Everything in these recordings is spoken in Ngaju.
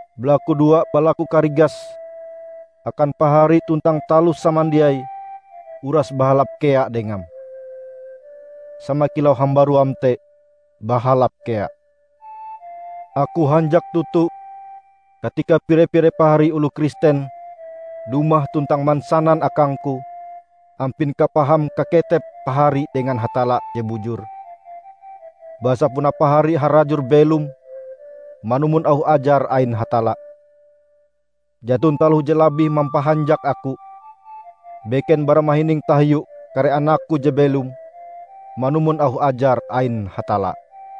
balakudoa balaku karigas akan pahari tuntang taloh samandiai uras bahalap kea dengam, sama kilau hambaruam te bahalap kea. Aku hanjak toto katika pire-pire pahari oloh Kristen dumah tuntang mansanan akangku ampin kapaham kaketep pahari dengan Hatalla je bujur, basa puna pahari harajur belom manumon auh ajar ain Hatalla. Jaton taloh je labih mampahanjak aku, beken bara mahining tahiu kare anakku je belom manumon auh ajar ain Hatalla.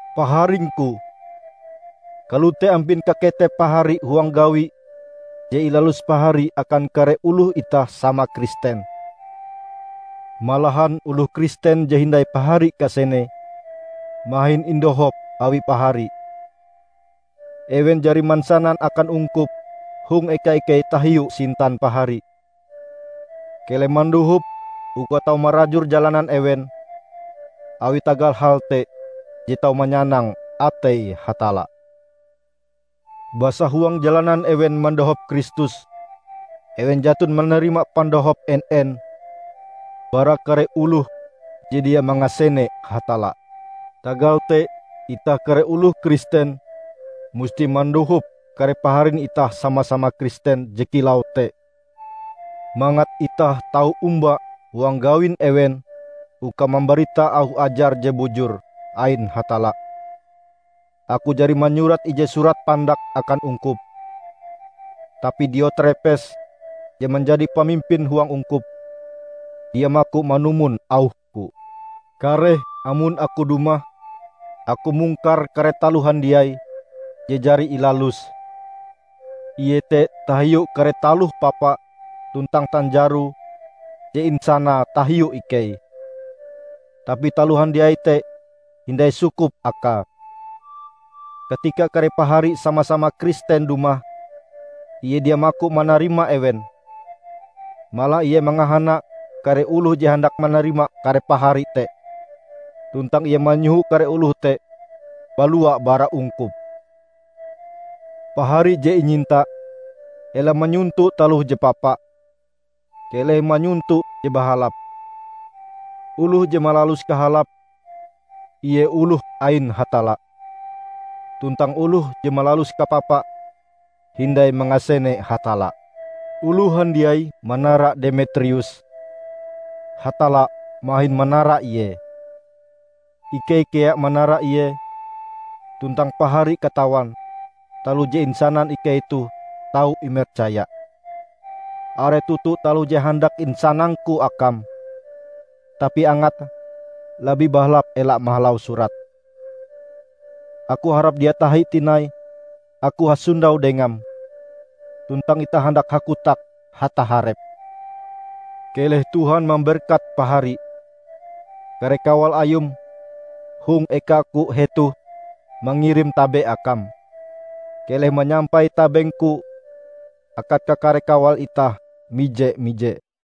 Paharingku! Kalote ampin kaketep pahari huang gawi je ilalus pahari akan kare oloh itah sama Kristen; malahan oloh Kristen je hindai pahari kasenee mahin indohop awi pahari. Ewen jari mansanan akan ungkup hong eka ikei tahiu sintan pahari. Keleh mandohop uka tau marajur jalanan ewen awi tagal hal te je tau manyanang atei Hatalla, basa huang jalanan ewen mandohop Kristus, ewen jaton manarima pandohop en-en bara kare oloh je dia mangasene Hatalla. Tagal te itah kare oloh Kristen, musti mandohop kare paharin itah sama-sama Kristen je kilau te, mangat itah tau omba huang gawin ewen uka mambarita auh ajar je bujur ain Hatalla. Aku jari manyurat ije surat pandak akan ungkup, tapi Diotrepes je manjadi pamimpin huang ungkup, dia maku manumon auhku. Kareh amon aku dumah, aku mungkar kare taloh handiai je jari ilaluse, iete tahiu kare taloh papa tuntang tanjaro je insanae tahiu ikei! Tapi taloh handiai te hindai sukup akae. Katika kare pahari sama-sama Kristen dumah, ie dia maku manarima ewen. Malah ie mangahana kare oloh je handak manarima kare pahari te, tuntang ie manyoho kare oloh te balua bara ungkup! Pahari je inyinta, ela manyonto taloh je papa. Keleh manyonto je bahalap. Oloh je malalus kahalap, ie oloh ain Hatalla. Tuntang oloh je malalus kapapa hindai mangasene Hatalla. Oloh handiai manara Demetrius. Hatalla mahin manara ie. Ikei kea manara ie, tuntang pahari katawan taloh je insanan ikei toh tau imercaya. Are toto taloh je handak insanangku akam, tapi angate labih bahalap ela mahalau surat. Aku harap dia tahi tinai aku hasondau dengam, tuntang itah handak hakotak hataharep. Keleh Tuhan mamberkat pahari. Kare kawal ayum hong ekaku hetoh mangirim tabe akam. Keleh manyampai tabengku akan kakare kawal itah mije-mije.